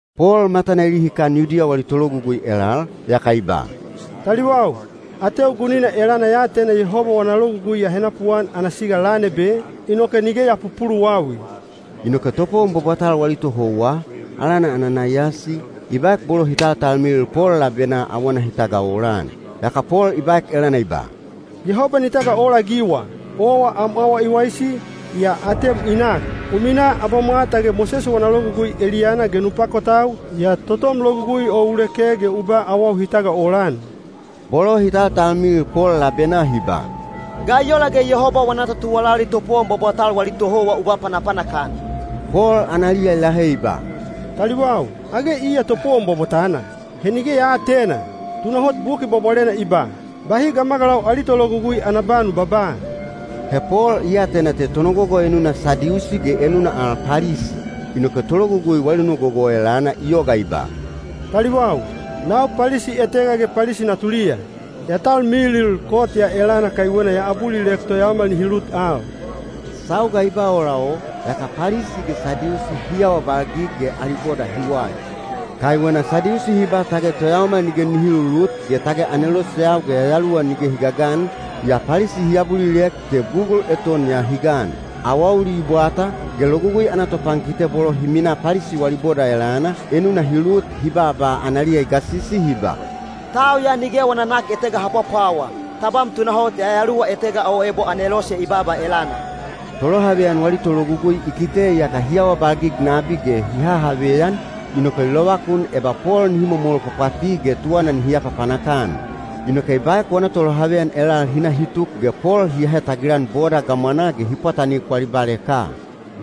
Pol matana i lihikan Yudiya wali tologugui elal, yaka i ba, “Taliwau, ateu gunina elana ya atena Yehoba wana logugui ya henapuan ana siga lan ebe, inoke nige ya pupuluwawi.” Inoke topowon bwabwatal wali tohouwa, alana Ananaiyasi, i baek bolo hi taltalmilil Pol labenaa awana hi tagaolan. Yaka Pol i baek elana i ba, “Yehoba ni tagaolaagiwa! Owa am awa i waisi, yaa atem i nak! U minaa abamwa tage Mosese wana Logugui eliyana ge nu pakotau, yaa totom Logugui o u leke ge u ba awau hi tagaolan.” Bolo hi taltalmilil Pol labenaa hi ba, “Ga i ola ge Yehoba wana totuwalali topowon bwabwatal wali tohouwa u ba panapanak-an?” Pol analiya i lahe i ba, “Taliwau! Age iya topowon bwabwatana? He nige ya aatena! Tunahot Buki Bwabwalena i ba, ‘Bahi gamagalau ali tologugui ana ba nu babaa.’” He Pol i atena te tonogogo enuna Sadiusi ge enuna al Palisi. Inoke tologugui wali nogogo o elana i yoga i ba, “Taliwau, nau Palisi etega ge Palisi natuliya. Ya talmilil kot ya elana kaiwena ya abulilek toyaomal nihi lut al.” Sauga i ba ola o, yaka Palisi ge Sadiusi hi awabalgig ge ali boda hi wali. Kaiwena Sadiusi hi ba tage toyaomal nige nihi lulut ge tage aneloseyau ge yayaluwa nige hi gagan, yaa Palisi hi abulilek te bugul eton ya hi gan. Awauli i bwata, ge Logugui ana topankite bolo hi minaa Palisi wali boda elana, enuna hi lut hi baaba analiya i gasisi hi ba, “Tau ya nige wana nak etega ha pwapwawa. Tabam tunahot yayaluwa etega o ebo anelose i baaba elana.” Tolohaveyan wali tologugui i kite iyaka hi awabalgig nabi ge hi hahaveyan, inoke i lovakun eba Pol nihi momol pwapwati ge tuwana nihi apapanak-an. Inoke i baek wana tolohaveyan elal hi na hi tuk ge Pol hi ahe tagilan boda gamwanaa ge hi pwatanik wali baleka.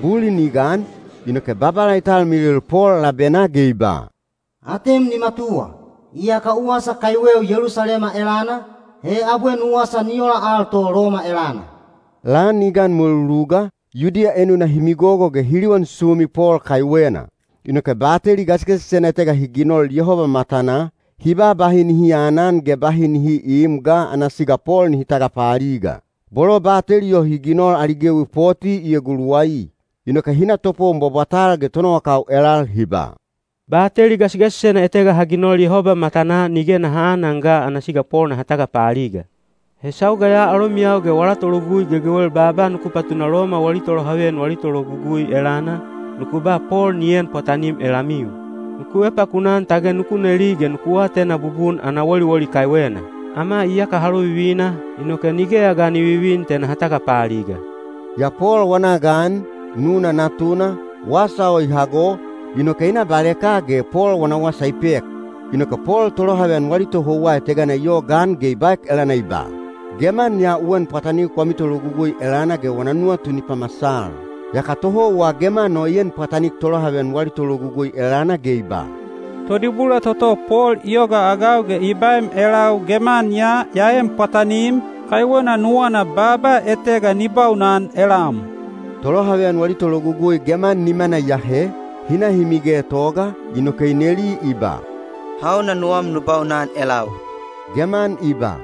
Bulin i gan, inoke Babala i talmilil Pol labenaa ge i ba, “Atem ni matuwa! Iyaka u wasa kaiweu Yelusalema elana, he abwe nu wasa ni ola al to Loma elana.” Lan i gan mweluluga, Yudiya enuna hi migogo ge hi liwan sumi Pol kaiwena. Inoke bateli gasigasisena etega hi ginol Yehoba matanaa, hi ba bahi nihi aanan ge bahi nihi iim ga ana siga Pol nihi tagapaaliga. Bolo bateli o hi ginol ali gewi poti i eguluwai. Inoke hi na topowon bwabwatal ge tonowakau elal hi ba, “Bateli gasigasisena etega ha ginol Yehoba matanaa nige naha aanan ga ana siga Pol naha tagapaaliga. He sauga ya alomiyau ge wala tologugui gegewel baaba nuku patuna Loma wali tolohaveyan wali tologugui elana, nuku ba Pol ni en pwatanim elamiu. Nuku epakunaan tage nuku neli ge nuku atena bubun ana woliwoli kaiwena. Ama iyaka ha lovivina, inoke nigeya ga ni vivin te naha tagapaaliga.” Yaa Pol wana gan, nuna natuna, wasa o i hago, inoke i na baleka ge Pol wana wasa i pek. Inoke Pol tolohaveyan wali tohouwa etegana i yogaan ge i baek elana i ba, “Geman ya u en pwatanik wami tologugui elana ge wana nuwatu ni pamasal.” Yaka tohouwa geman o i en pwatanik tolohaveyan wali tologugui elana ge i ba, “Todibula toto Pol i yogaagau ge i baem elau geman ya ya en pwatanim, kaiwena nuwana baaba etega ni baunan elam.” Tolohaveyan wali tologugui geman nimana i ahe, hi na hi migetoga, inoke i neli i ba, “Hauna nuwam nu baunan elau?” Geman i ba,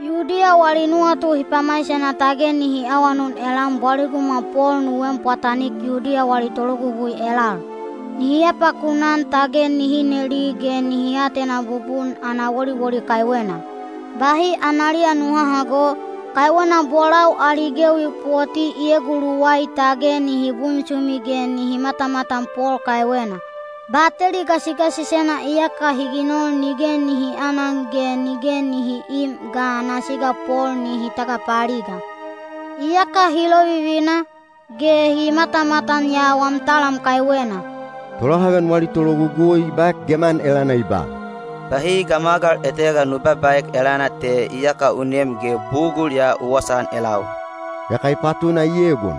“Yudiya wali nuwatu hi pamaisena tage nihi awanun elam bwaligumwa Pol nu en pwatanik Yudiya wali tologugui elal. Nihi epakunaan tage nihi neli ge nihi atena bubun ana woliwoli kaiwena. Bahi analiya nu hahago, kaiwena bolau ali gewi poti i eguluwai tage nihi bunsumi ge nihi matamatan Pol kaiwena. Bateli gasigasisena iyaka hi ginol nige nihi aanan ge nige nihi iim ga ana siga Pol nihi tagapaaliga. Iyaka hi lovivina, ge hi matamatan ya wam talam kaiwena.” Tolohaveyan wali tologugui i baek geman elana i ba, “Bahi gamagal etega nu babaaek elana te iyaka u nem ge bugul ya u wasaan elau.” Yaka i patuna i egon.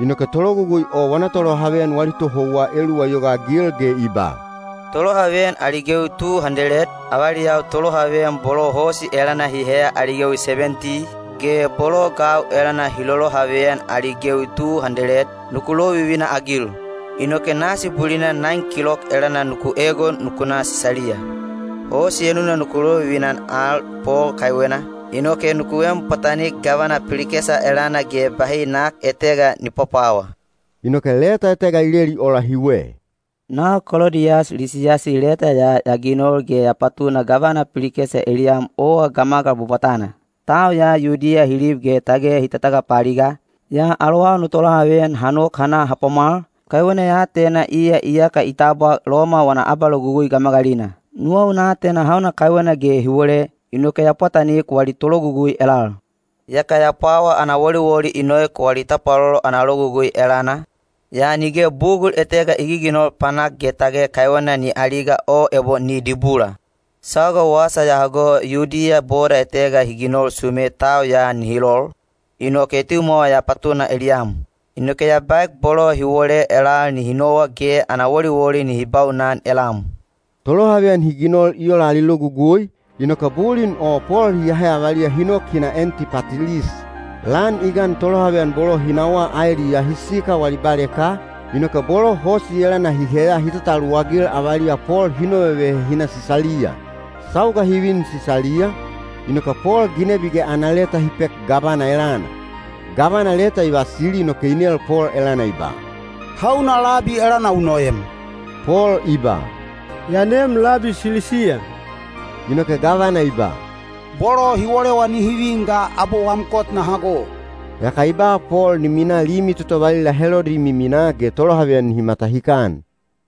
Inoke tologugui o wana tolohaveyan wali tohouwa eluwa i yogaagil ge i ba, “Tolohaveyan ali gewi tu handeled, avaliyau tolohaveyan bolo hosi elana hi heya ali gewi sebenti, ge bolo gau elana hi lolohaveyan ali gewi tu handeled, nuku lovivina-agil. Inoke nasi bulina naen kilok elana nuku egon nuku na Sisaliya. Hosi enuna nuku lovivina-an al Pol kaiwena, inoke nuku en pwatanik gavana Pilikesa elana ge bahi nak etega ni pwapwawa.” Inoke leta etega i leli ola hiwe: Nau Kolodiyas Lisiyasi leta ya ya ginol ge ya patuna gavana Pilikesa eliyam owa gamagal bwabwatana. Tau ya Yudiya hi lib ge tage hi tatagapaaliga, yaa alowau no tolohaveyan ha nok ha na ha pwamwal, kaiwena ya atena iya iyaka i tabwa Loma wana abalogugui gamagalina. Nuwau na atena hauna kaiwena ge hi wole, inoke ya pwatanik wali tologugui elal. Yaka ya pwawa ana woliwoli i noek wali tapwalolo ana logugui elana, yaa nige bugul etega i giginol panak ge tage kaiwena ni aliga o ebo ni dibula. Sauga wasa ya hago Yudiya boda etega hi ginol sume tau ya nihi lol, inoke etimwawa ya patuna eliyam. Inoke ya baek bolo hi wole elal nihi nowa ge ana woliwoli nihi baunan elam. Tolohaveyan hi ginol i ola ali logugui, inoke bulin o Pol hi ahe avaliya hi nok hi na Antipatilis. Lan i gan tolohaveyan bolo hi nawa aeliyaa hi sikal wali baleka, inoke bolo hosi elana hi heya hi tataluwagil avaliya Pol hi novevehe hi na Sisaliya. Sauga hi vin Sisaliya, inoke Pol ginebi ge ana leta hi pek gavana elana. Gavana leta i vasili inoke i nel Pol elana i ba, “Hauna labi elana u noem?” Pol i ba, “Ya neem labi Silisiya.” Inoke gavana i ba, “Bolo hi wolewa nihi vin ga abwe wam kot na hago.” Yaka i ba Pol ni minaa limi toto valila Helodi i miminaa ge tolohaveyan nihi matahikan.